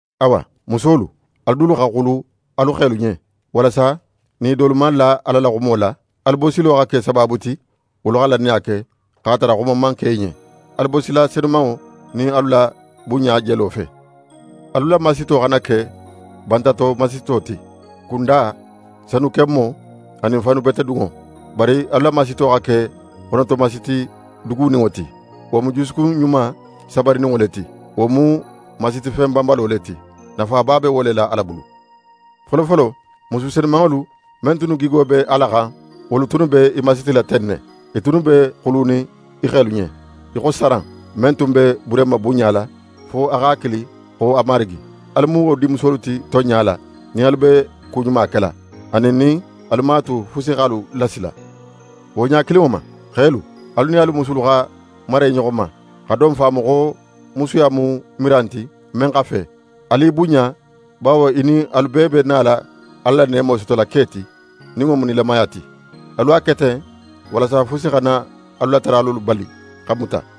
Awa, musolu, alu dulu xa xulu alu xelu ɲen, walasa nin i dolu man la Ala la xumo la, alu bosilo xa ke sabaabu ti wolu xa lannaya ke, x'a tara xuma man ke i ɲen, alu bosila senumanŋo nin alu la bunɲa jelo fe. Alu la masito xana ke bantato masito ti: Kunda, sanukenmo, anin faanubetedunŋo. Bari alu la masito xa ke xonoto masiti duguninŋo ti, wo mu jusukun ɲuma sabarininŋo le ti, wo mu masitifen banbalo le ti. Nafaba be wo le la Ala bulu. Folofolo, musu senumanŋolu men tunnu gigo be Ala xan, wolu tunnu be i masitila ten ne. I tunnu be xulunin i xelu ɲen, í xo Saran, men tun be Burehima bunɲala fo a x'a kili xo a marigi. Alu mu wo dinmusolu ti tonɲa la, nin alu be ku ɲuma kela, anin nin alu man a tu fusi x'alu lasila. Wo ɲa kilinŋo ma, xelu, alu nin alu musulu xa mara i ɲoxo ma, xa don faamu xo musuya mu miran ti, men xa fe. Alu i bunɲa bawo i nin alu bee be nala Ala la neemo sotola ke ti, nin wo mu nilamaya ti. Alu a ke ten, walasa fusi xana alu la taralolu bali xa muta.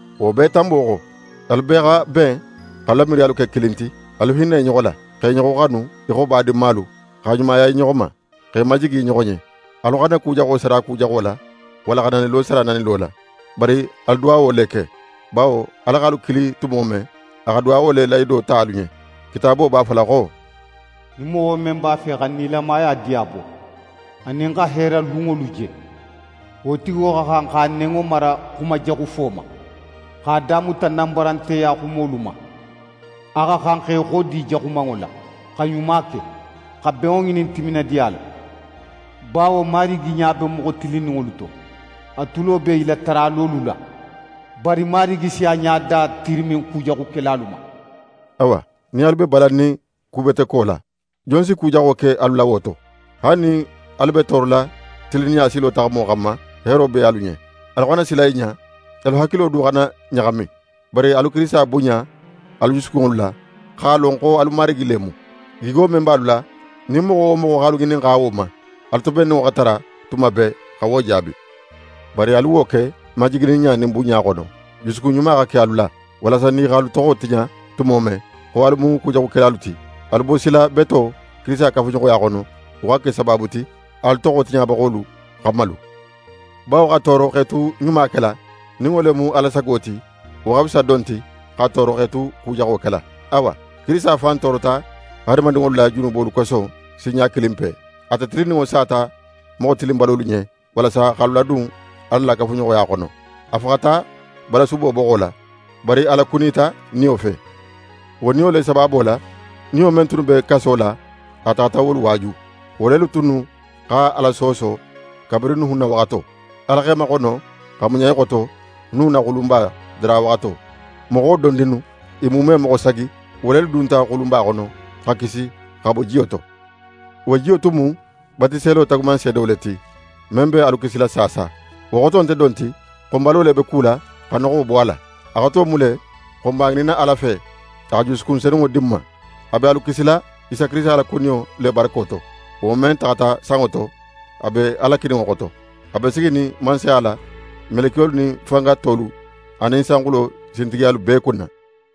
Wo bee tanbo xo, alu bee xa ben x'alu la miiriyalu ke kilin ti. Alu hinna i ɲoxo la, x'e ɲoxo xanu í xo badinmalu, xa ɲumaya i ɲoxo ma, x'e majigi i ɲoxo ɲen. Alu xana ku jaxo sara ku jaxo la, walla xa nanilo sara nanilo la. Bari alu duwawo le ke, bawo Ala x'alu kili tumo men, a xa duwawo le lahido ta alu ɲen. Kitaabo b'a fola xo: «Nin moxo men b'a fe xa nilamaya diyabo, anin xa heera lunŋolu je, wo tigo xa xan x'a nenŋo mara xumajaxufo ma, x'a da muta nanbaranteya xumolu ma. A xa xan xa í xodi jaxumanŋo la, xa ɲuma ke, xa benŋo ŋinin timinadiya la. Bawo Marigi ɲa be moxo tilinninŋolu to, a tulo be i la taralolu la, bari Marigi si a ɲada tirimin kujaxukelalu ma.» Awa, nin alu be balannin kubeteko la, jon si ku jaxo ke alu la wo to? Haali nin alu be toorola tilinninɲa silo taxamo xanma, heero be alu ɲen. Alu xana sila i ɲa, alu hakilo du xana ɲaxami. Bari alu Kirisita bunɲa alu jusukunŋolu la, x'a lon xo alu Marigi le mu. Gigo men be alu la, nin moxo wo moxo x'alu ŋininxa wo ma, alu tobenninŋo xa tara tuma bee xa wo jaabi. Bari alu wo ke majigininɲa nin bunɲa xono. Jusukun ɲuma xa ke alu la, walasa nin i x'alu toxo tiɲa tumo men, xo alu mu kujaxukelalu ti, alu bosila beto, Kirisita kafuɲoxoya xono, wo xa ke sabaabu ti, alu toxo tiɲabaxolu xa malu. Bawo xa tooro x'é tu ɲuma kela, nin wo le mu Ala sago ti, wo xa fisa don ti xa tooro x'é tu ku jaxo kela. Awa, Kirisita fan toorota hadamadinŋolu la junubolu koso sinɲa kilinpe. Ate tilinninŋo sata moxo tilinbalolu ɲen, walasa x'alu ladun Ala la kafuɲoxoya xono. A faxata balasubo boxo la, bari a lakunita Niyo fe. Wo Niyo le sabaabo la, niyo men tunnu be kaso la, a taxata wolu waaju. Wo lelu tunnu xa Ala sooso kabirin Nuhun na waxato. Ala x'e maxono xa muɲa i xoto Nuhun na xulunba dara waxato. Moxo dondinnu, i muume moxo sagi, wo lelu dunta xulunba xono, xa kisi xa bo jiyo to. Wo jiyo tun mu batiselo taagumanseedo le ti, men be alu kisila saasa. Wo xoto nte don ti xo n balo le be kula xa noxo bo a la. A xoto mu le xo n b'a ŋininna Ala fe, a xa jusukun senunŋo di n ma. A be alu kisila Isa Kirisita la kuniyo le barako to, wo men taxata sanŋo to, a be Ala kininŋo xoto, a be siginin mansaya la, melekiyolu nin fanga tolu anin sanxulo sintigiyalu bee kunna.